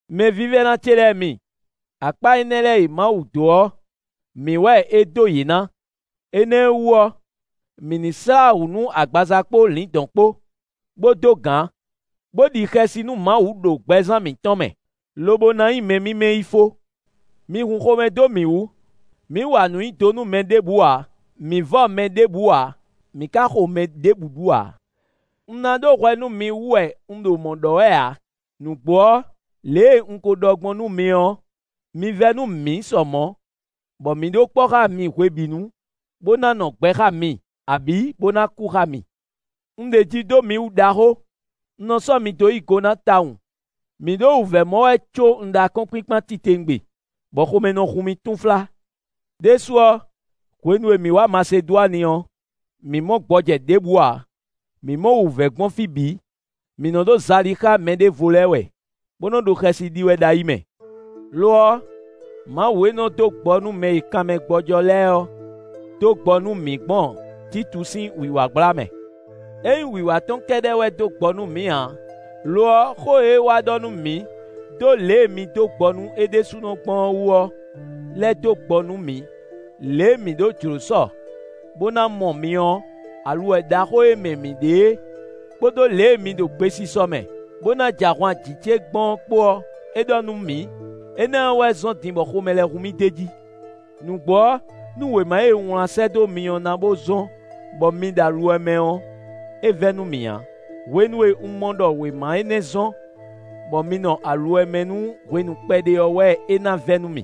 Mɛvívɛ́ná ce lɛ́ɛ mi, akpá énɛ́ lɛ́ɛ e Mawu dó ɔ́, mǐ wɛ é dó yě ná. Énɛ́ ɔ́ wú ɔ́, mǐ ní slá wǔ nú agbaza kpó lǐndɔ̌n kpó, bó dó gǎn, bó ɖi xɛsi nú Mawu ɖo gbɛzán mǐtɔn mɛ, lobo ná nyí mɛ mímɛ́ yi fó. Mi hun xomɛ dó mǐ wú! Mǐ wa nǔɖé nyi do nú mɛ ɖěbǔ ǎ; mǐ vɔ mɛ ɖěbǔ ǎ; mǐ ka xo mɛ ɖěbǔ ɖu ǎ. Un ná ɖó hwɛ nú mi wú wɛ un ɖo mɔ̌ ɖɔ wɛ ǎ. Nǔgbó ɔ́, lě e un ko ɖɔ gbɔn nú mi ɔ́, mi vɛ́ nú mǐ sɔ mɔ̌, bɔ mǐ ɖo kpɔ́ xá mi hwebǐnu, bó ná nɔ gbɛ xá mi, abǐ bó ná kú xá mi. Un ɖeji dó mi wú ɖaxó; un nɔ sɔ́ mi dó yí go ná tawun. Mǐ ɖo wǔvɛ́ mɔ wɛ có un ɖó akɔ́nkpinkpan titewungbe, bɔ xomɛ nɔ hun mì túnflá. Đésú ɔ́, hwenu e mǐ wá Masedwani ɔ́, mǐ mɔ gbɔjɛ́ ɖěbǔ ǎ; mǐ mɔ wǔvɛ́ gbɔn fí bǐ: mǐ nɔ ɖo zali xá mɛɖěvo lɛ́ɛ wɛ, bó nɔ́ ɖo xɛsi ɖi wɛ ɖo ayi mɛ. Lo ɔ́, Mawu e nɔ dó gbɔ nú mɛ e kanmɛ gbɔ́jɔ́ lɛ́ɛ ɔ́, dó gbɔ nú mǐ gbɔn Títu sín wǐwá gbla mɛ. É nyí wǐwá tɔn kɛ́ɖɛ́ wɛ dó gbɔ nú mǐ ǎ; lo ɔ́, xó e é wá ɖɔ nú mǐ dó lě e mi dó gbɔ nú é ɖésúnɔ gbɔn ɔ́ wú ɔ́ lɛ́ dó gbɔ nú mǐ. Lě e mi ɖó jlǒ sɔ, bó ná mɔ mǐ ɔ́, aluwɛ ɖaxó e mɛ mi ɖe é, kpódó lě e mi ɖo gbesisɔ mɛ, bó ná jɛ ahwan jǐ ce gbɔn ɔ́ kpó ɔ́, é ɖɔ nú mǐ. Énɛ́ ɔ́ wɛ zɔ́n din bɔ xomɛ lɛ́ hun mì d'é jí. Nǔgbó ɔ́, nú wěma e un wlán sɛ́ dó mi ɔ́ na bo zɔ́n bɔ mi ɖo aluwɛ mɛ ɔ́, é vɛ́ nú mì ǎ. Hwenu e un mɔ ɖɔ wěma énɛ́ zɔ́n, bɔ mi nɔ aluwɛ mɛ nú hwenu kpɛɖé ɔ́ wɛ é ná vɛ́ nú mì.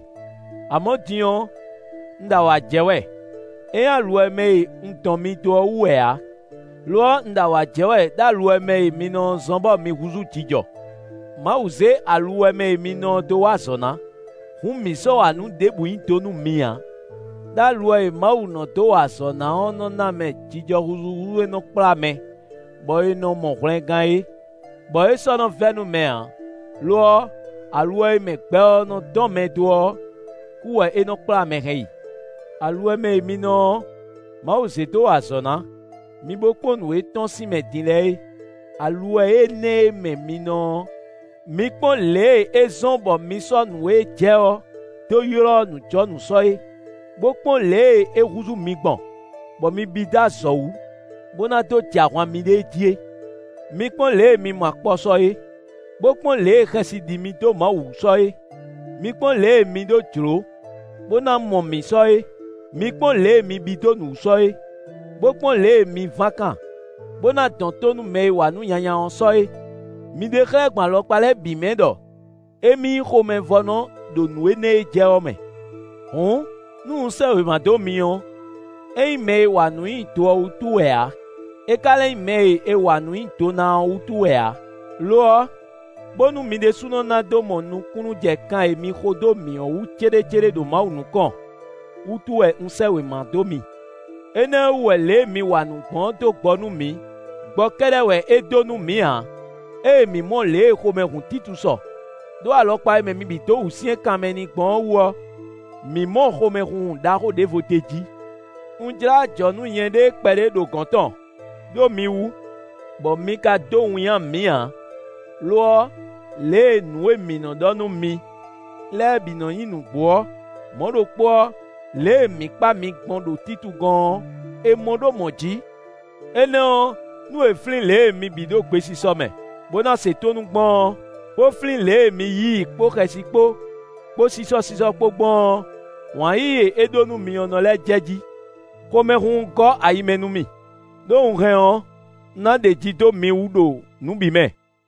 Amɔ̌ din ɔ́, un ɖo awǎ jɛ wɛ; é nyí aluwɛ mɛ e un dɔn mi dó ɔ́ wú wɛ ǎ; lo ɔ́, un ɖo awǎ jɛ wɛ ɖó aluwɛ e mɛ mi nɔ ɔ́ zɔ́n bɔ mi húzú jijɔ. Mawu zě aluwɛ mɛ e mi nɔ ɔ́ dó wa azɔ̌ ná; hǔn mǐ sɔ́ wa nǔ ɖěbǔ nyi do nú mi ǎ. Đó aluwɛ e Mawu nɔ dó wa azɔ̌ ná ɔ́ nɔ́ ná mɛ jijɔ húzúhúzú e nɔ kplá mɛ bɔ è nɔ mɔ hwlɛngán é, bɔ é sɔ́ nɔ vɛ́ nú mɛ ǎ. Lo ɔ́, aluwɛ e mɛ gbɛ ɔ́ nɔ dɔn mɛ dó ɔ́, kú wɛ é nɔ kplá mɛ hɛn yi. Aluwɛ e mɛ mi nɔ ɔ́, Mawu zě dó wa azɔ̌ ná; mi bó kpɔ́n nǔ e tɔ́n sín mɛ din lɛ́ɛ é! Aluwɛ énɛ́ e mɛ mi nɔ ɔ́, mi kpɔ́n lě e é zɔ́n bɔ mi sɔ́ nǔ e jɛ ɔ́ dó ylɔ́ nǔjɔnǔ sɔ é, bó kpɔ́n lě e é húzú mi gbɔn, bɔ mi bí dó azɔ̌ wú, bó ná dó jɛ ahwan miɖée jí é. Mi kpɔ́n lě e mi mɔ akpɔ sɔ é, bó kpɔ́n lě e xɛsi ɖi mi dó Mawu wú sɔ é. Mi kpɔ́n lě e mi ɖó jlǒ, bó ná mɔ mǐ sɔ é. Mi kpɔ́n lě e mi bí dó nǔ wú sɔ é, bó kpɔ́n lě e mi ván kan, bó ná dɔn tó nú mɛ e wa nǔ nyanya ɔ́ sɔ é! Mi ɖe xlɛ́ gbɔn alɔkpa lɛ́ɛ bǐ mɛ ɖɔ émí nyí xomɛvɔ́nɔ ɖo nǔ énɛ́ e jɛ ɔ́ mɛ. Hǔn, nú un sɛ́ wěma dó mi ɔ́, é nyí mɛ e wa nǔ nyi do ɔ́ wútu wɛ ǎ; é ka lɛ́ nyí mɛ e è wa nǔ nyi do ná ɔ́ wútu wɛ ǎ. Lo ɔ́, bónú mi ɖésúnɔ ná dó mɔ nukúnnú jɛ kan e mi xo dó mǐ ɔ́ wú céɖécéɖé ɖo Mawu nukɔn wútu wɛ un sɛ́ wěma dó mi. Énɛ́ ɔ́ wú wɛ lě e mi wa nǔ gbɔn ɔ́ dó gbɔ nú mǐ. Gbɔ kɛ́ɖɛ́ wɛ é dó nú mǐ ǎ. Ée mǐ mɔ lě e xomɛ hun Títu sɔ, ɖó alɔkpa e mɛ mi bǐ dó wǔsyɛ́n kanmɛ n'i gbɔn ɔ́ wú ɔ́, mǐ mɔ xomɛhunhun ɖaxó ɖěvo d'é jí. Un jlá ajɔ̌ nú nyɛɖée kpɛɖé ɖo gɔ̌n tɔn, ɖó mi wú, bɔ mi ka dó winnyá mǐ ǎ. Lo ɔ́, lě e nǔ e mǐ nɔ́ ɖɔ nú mi lɛ́ɛ bǐ nɔ nyí nǔgbó ɔ́, mɔ̌ ɖokpó ɔ́, lě e mǐ kpa mi gbɔn ɖo Títu gɔ́n ɔ́, è mɔ ɖó mɔ̌ jǐ. Énɛ́ ɔ́, nú é flín lě e mi bǐ ɖo gbesisɔ mɛ, bó ná se tónú gbɔn ɔ́, bó flín lě e mi yí i kpó xɛsi kpó, kpó sísɔ́sísɔ́ kpó gbɔn ɔ́, wǎn yíyí e é ɖó nú mi ɔ́ nɔ lɛ́ jɛjí. Xomɛhunhun gɔ́ ayi mɛ nú mì, ɖó un hɛn ɔ́, un ná ɖeji dó mi wú ɖo nǔ bǐ mɛ.